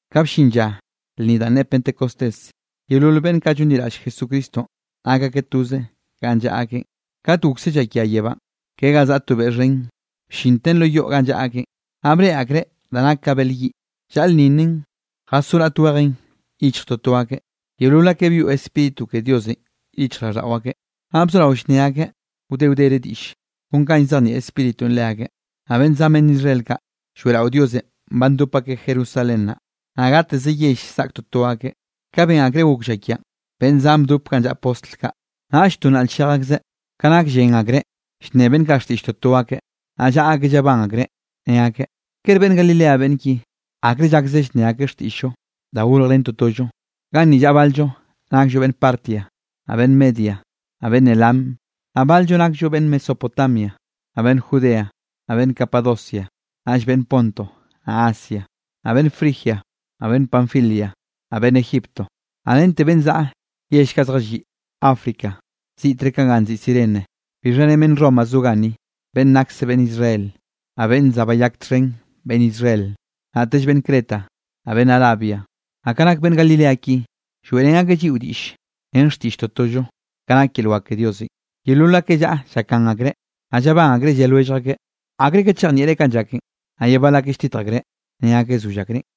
Ka bllin lla lnni danꞌ ne Pentecostés, yeolol beꞌnn kaꞌ llonliraꞌll Jesucristonꞌ, nak akeꞌ toze ganꞌ llaꞌa akeꞌn. Kat gokse llakia yebánꞌ ke ga zaꞌa to beꞌ xhen, bllinte lo yoꞌ ganꞌ llaꞌa akeꞌn. Naꞌ breꞌe akreꞌ da nak ka bel yiꞌ, llalnninnen jasó raꞌt wejen yichj toto akeꞌ. Yeolol akeꞌ byoꞌ Spíritu ke Diosenꞌ yichjraꞌlldaꞌo akeꞌ, naꞌ bzorao llnne akeꞌ wde wdere diꞌll, kon ka llzejnieꞌ Spíritunꞌ leakeꞌ. Naꞌ beꞌnn zan beꞌnn Israel kaꞌ lloeꞌrao Diosenꞌ ba ndop akeꞌ Jerusalén naꞌ, naꞌ gateze yell zaꞌk toto akeꞌ. Ka ben akreꞌ gok llakianꞌ, beꞌnn zan bdop ganꞌ llaꞌa postl kaꞌ, naꞌll to nnaꞌl-llej akzeꞌ, ka nak llen akreꞌ llnne beꞌnn kaꞌ xtiꞌll toto akeꞌ. Naꞌ llaꞌa akeꞌ llabán akreꞌ, ne akeꞌ: —¿Kere beꞌnn Galilea beꞌnn ki? ¿Akre llakze llnne akeꞌ xtiꞌll-llo da gorjrén totollo? Ganni llaꞌa bal-llo nakllo beꞌnn Partia, naꞌ beꞌnn Media, naꞌ beꞌnn Elam. Naꞌ bal-llo nakllo beꞌnn Mesopotamia, naꞌ beꞌnn Judea, naꞌ beꞌnn Capadocia, naꞌll beꞌnn Ponto, naꞌ Asia. Naꞌ beꞌnn Frigia, naꞌ beꞌnn Panfilia, naꞌ beꞌnn Egipto, naꞌ rente beꞌnn zaꞌa yell kaꞌ zjalliꞌ África, ziꞌtre ka ganꞌ nziꞌi Cirene, bixha ren beꞌnn Roma zo ganni, beꞌnn nakse beꞌnn Israel, naꞌ beꞌnn za bayak txhen beꞌnn Israel. Naꞌtell beꞌnn Creta, naꞌ beꞌnn Arabia. ¡Naꞌ ka nak beꞌnn Galilea ki, lloeꞌrén akeꞌ lliꞌo diꞌll ren xtiꞌll totollo, kanꞌ nak yel wak ke Diosenꞌ! Yeolol akeꞌ llaꞌa llakgan akreꞌ, naꞌ llabán akreꞌ lle lwellj akeꞌ: —¿Akre ka chejnieꞌre kanꞌ llaken? Naꞌ ye bal akeꞌ lltitj akreꞌ, ne akeꞌ: —Zoll akreꞌn.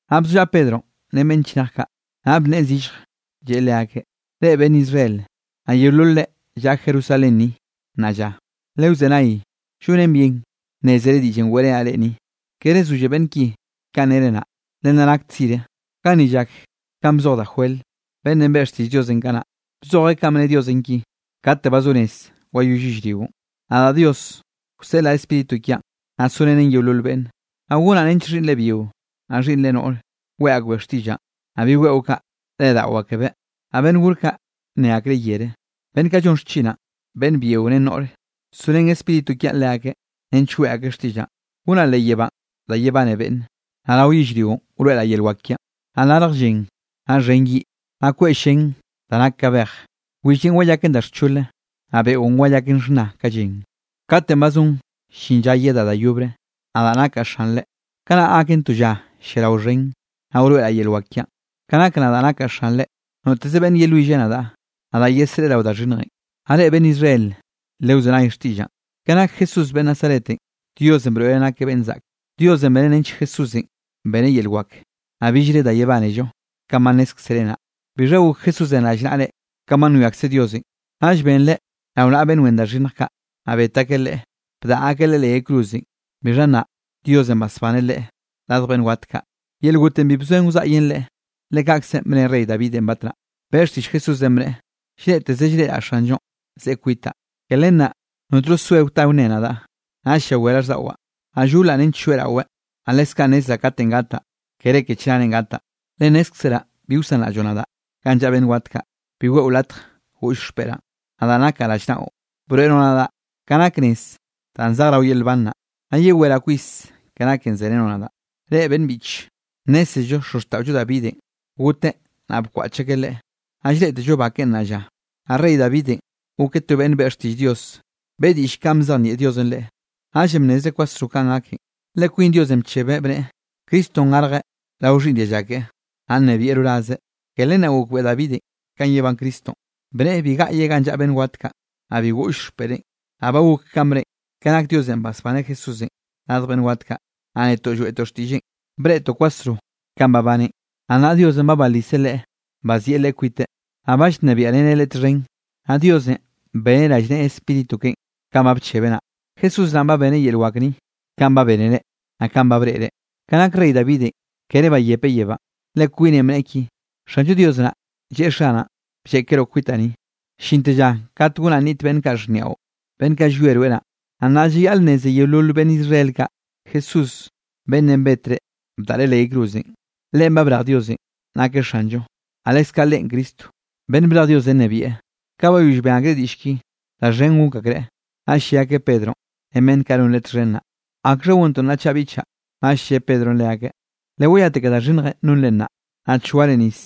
Naꞌ bzollaꞌa Pedronꞌ ren beꞌnn chnej kaꞌ, naꞌ bnneꞌe zillj, lleꞌe leakeꞌ: —Reꞌ beꞌnn Israel, naꞌ yeolol reꞌ llaꞌa Jerusalén ni nnaꞌ lla, lewzenay, llonen bien nnézere diꞌllenꞌ weꞌrenaꞌ reꞌ ni. Kere zolle beꞌnn ki kanꞌ nere naꞌ, le nna nak tzire. Ganni llak kanꞌ bzoj da Joel, beꞌnnenꞌ beꞌe xtiꞌll Diosenꞌ kanaꞌ, bzojeꞌ kanꞌ bne Diosenꞌ ki: Kate ba zo rez wayoll yellrio, nadaꞌ Dios wseꞌlaꞌ Spíritu kiaꞌn, naꞌ sorenen yeolol beꞌnne, naꞌ gonaꞌ nench xhiꞌnnre byio, naꞌ xhiꞌnnre noꞌr, weꞌe akbeꞌ xtiꞌllaꞌn. Naꞌ bi weꞌo kaꞌ, reꞌdaꞌo akebeꞌ, naꞌ beꞌnn gor kaꞌ, nne akreꞌ yere. Beꞌnn kaꞌ llon xchinaꞌn beꞌnn byio ren noꞌre, sorén Spíritu kiaꞌn leakeꞌ, nench weꞌe akeꞌ xtiꞌllaꞌn. Gonaꞌ leꞌ yebánꞌ da yebane beꞌnne, naꞌ rao yellrio wroeꞌraꞌ yel wak kiaꞌn, naꞌ larj llen, naꞌ xhen yiꞌ, naꞌ kweꞌ llén da nak ka bej. Willenꞌ wayaken da xchole, naꞌ beꞌon wayaken xhna ka llen, katenꞌ ba zon llin lla yedaꞌ da yobre, nadaꞌ nakaꞌ Xanre. Kanaꞌ gaken to lla lliarao xhen, naꞌ wroeꞌraꞌ yel wak kiaꞌn. Ka nak nadaꞌ nakaꞌ Xanre, noteze beꞌnn yelwille nadaꞌ, nadaꞌ yesreꞌe rao da xhinnjenꞌ. ’Naꞌ reꞌ beꞌnn Israel, lewzenay xtiꞌllaꞌn. Ke nak Jesús beꞌnn Nazaretenꞌ, Diosenꞌ broeꞌreꞌ nakeꞌ beꞌnn zaꞌke. Diosenꞌ beneꞌ nench Jesúsenꞌ beneꞌ yel wak, naꞌ billre da yebánello kanꞌ ba nnézkzere naꞌ. Bixha gok Jesúsenꞌ rallnaꞌre kanꞌ ba nwiakze Diosenꞌ, naꞌll benreꞌ rao naꞌa beꞌnn wen da xhinnj kaꞌ, naꞌ bet akeꞌ Leꞌe bdaꞌa akeꞌ Leꞌe leꞌ yay cruzenꞌ. Bixha nnaꞌ Diosenꞌ basbaneꞌ Leꞌe radj beꞌnn wat kaꞌ, yel gotenꞌ bi bzoen wzaꞌyen Leꞌe. Le kaꞌkzenꞌ bne rey Davidenꞌ batnaꞌ, beꞌe xtiꞌll Jesúsenꞌ bneꞌe: Llreꞌteze llreꞌraꞌ Xanllonꞌ, zeꞌe kwitaꞌ, ke len naꞌ notno soe wta wnne nadaꞌ. Naꞌll llawé raꞌlldaꞌwaꞌ, naꞌ llolaꞌ nench lloeꞌraweꞌ. Naꞌ leskaꞌ nnezraꞌ katenꞌ gataꞌ, kere ke chnarenꞌ gataꞌ. Le nnézkzeraꞌ bi wsanraꞌlloꞌ nadaꞌ ganꞌ llaꞌa beꞌnn wat kaꞌ. Bi weꞌo latj goꞌll xpeꞌraꞌn, nadaꞌ nakaꞌ rallnaꞌo. Broeꞌroꞌ nadaꞌ ka nak nez danꞌ zej rao yel nban naꞌ, naꞌ yeweraꞌ kwis ke naken zerenoꞌ nadaꞌ. ’Reꞌ beꞌnn biꞌche, nnézello xozxtaꞌollo Davidenꞌ goteꞌ, naꞌ bkwaꞌch akeꞌ leꞌe, naꞌ llreꞌtello ba keꞌen nnaꞌ lla. Naꞌ rey Davidenꞌ gokeꞌ to beꞌnn beꞌe xtiꞌll Dios, beꞌe diꞌll kanꞌ bzejnieꞌ Diosenꞌ leꞌe, naꞌllenꞌ bnnezreꞌ kwasro kanꞌ gaken, le kwin Diosenꞌ bchebeꞌ bneꞌe, Cristonꞌ garjeꞌ rao xhiꞌnn dialla keꞌe, naꞌ nnebieꞌ rorazeꞌ. Ke len naꞌ gokbeꞌe Davidenꞌ kanꞌ yebán Cristonꞌ, bneꞌe bi gaꞌyeꞌ ganꞌ llaꞌa beꞌnn wat kaꞌ, naꞌ bi goꞌll xpeꞌreꞌn. Naꞌ ba gok kanꞌ bneꞌen, ke nak Diosenꞌ basbaneꞌ Jesúsenꞌ radj beꞌnn wat kaꞌ, naꞌ netoꞌ lloeꞌtoꞌ xtiꞌlleꞌn, breꞌtoꞌ kwasro kanꞌ babaneꞌn. Naꞌ nnaꞌ Diosenꞌ ba baliseꞌ Leꞌe, bazieꞌ Leꞌe kwiteꞌ, naꞌ ba llnebiaꞌreneꞌ Leꞌe txhen. Naꞌ Diosenꞌ beneꞌ rallneꞌe Spíritu keꞌen, kanꞌ ba bchebeꞌ naꞌ. Jesús naꞌn ba beneꞌ yel wak ni, kanꞌ ba bénere, naꞌ kanꞌ ba breꞌre. Ka nak rey Davidenꞌ kere bayepeꞌ yebánꞌ, le kwineꞌn bneꞌe ki: Xanllo Dios naꞌ, lleꞌe Xanaꞌn: “Blleꞌkeroꞌ kwitaꞌ ni, llinte lla kat gonaꞌ nniꞌt beꞌnn kaꞌ xhniaꞌo, beꞌnn kaꞌ llwie rweꞌ naꞌ.” ’Naꞌ nnaꞌ llayaꞌl nneze yeolol beꞌnn Israel kaꞌ, Jesús beꞌnnenꞌ betre bdaꞌre leꞌ yay cruzenꞌ, Leꞌen ba brej Diosenꞌ nakeꞌ Xanllo, naꞌ leskaꞌ Leꞌen Cristo beꞌnn brej Dios nnebieꞌ. Ka bayoll ben akreꞌ diꞌll ki, da xhen gok akreꞌ, naꞌll lle akeꞌ Pedronꞌ ren beꞌnn kaꞌ non leꞌe txhen naꞌ: —¿Akxha gontoꞌ nnaꞌ chaꞌ, biꞌchaꞌ? Naꞌll lle Pedronꞌ leakeꞌ: —Lewayate ke da xhinnjenꞌ nonre naꞌ, naꞌ choare nis,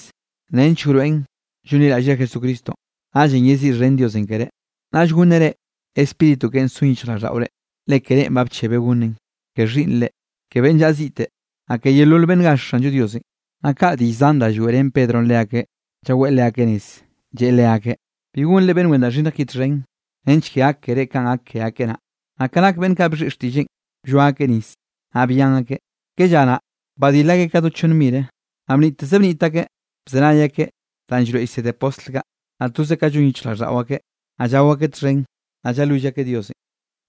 nench wroeꞌn llonliraꞌllre Jesucristonꞌ. Naꞌllenꞌ yeziꞌxhen Diosenꞌ keré, naꞌll gonneꞌ reꞌ Spíritu keꞌen son yichjraꞌlldaꞌore. Le ke reꞌn ba bchebeꞌ gonneꞌn, ke xhiꞌnnre, ke beꞌnn llaꞌa ziꞌte, naꞌ ke yeolol beꞌnn gaxh Xanllo Diosenꞌ. Naꞌ kaꞌ diꞌll zan da lloeꞌrén Pedronꞌ leakeꞌ, llaweꞌ leakeꞌ nez, lleꞌe leakeꞌ: —Bi gonre beꞌnn wen da xhinnj ki txhen, nench ke gak keré kanꞌ gak ke akeꞌ naꞌ. Naꞌ ka nak beꞌnn kaꞌ bxhiꞌi xtiꞌlleꞌn, blloa akeꞌ nis. Naꞌ byan akeꞌ, ke lla naꞌ badil akeꞌ ka do chonn mireꞌ. Naꞌ bniꞌtteze bniꞌt akeꞌ, bzenay akeꞌ danꞌ llroeꞌ llsede postl kaꞌ. Naꞌ toze ka llon yichjraꞌlldaꞌo akeꞌ, naꞌ llao akeꞌ txhen, naꞌ llalwill akeꞌ Diosenꞌ.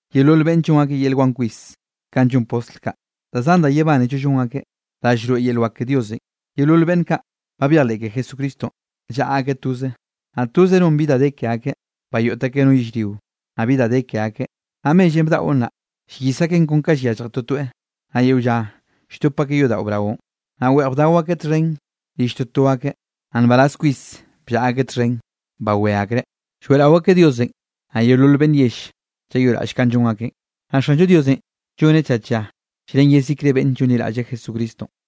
Yeolol beꞌnne llon akeꞌ yel wan kwis kanꞌ llon postl kaꞌ, da zan da yebánello llon akeꞌ, da llroeꞌ yel wak ke Diosenꞌ. Yeolol beꞌnn kaꞌ, ba byejleꞌ ke Jesucristonꞌ, llaꞌa akeꞌ toze, naꞌ toze non bi da de ke akeꞌ. Bayoꞌt akeꞌ no yellrio, naꞌ bi da de ke akeꞌ, naꞌ mellenꞌ bdaꞌon naꞌ, llyis akeꞌn kon ka yallje totoeꞌ. Naꞌ yeo lla lldop akeꞌ yodaꞌo braonꞌ, naꞌ weꞌj bdao akeꞌ txhen rill toto akeꞌ, naꞌ nbaraz kwis bllaꞌa akeꞌ txhen bawé akreꞌ. Lloeꞌrao akeꞌ Diosenꞌ, naꞌ yeolol beꞌnn yell llayoꞌraꞌll kanꞌ llon akeꞌn. Naꞌ Xanllo Diosenꞌ lloneꞌ tlla tlla llren yezikre beꞌnn llonliraꞌll Jesucristonꞌ.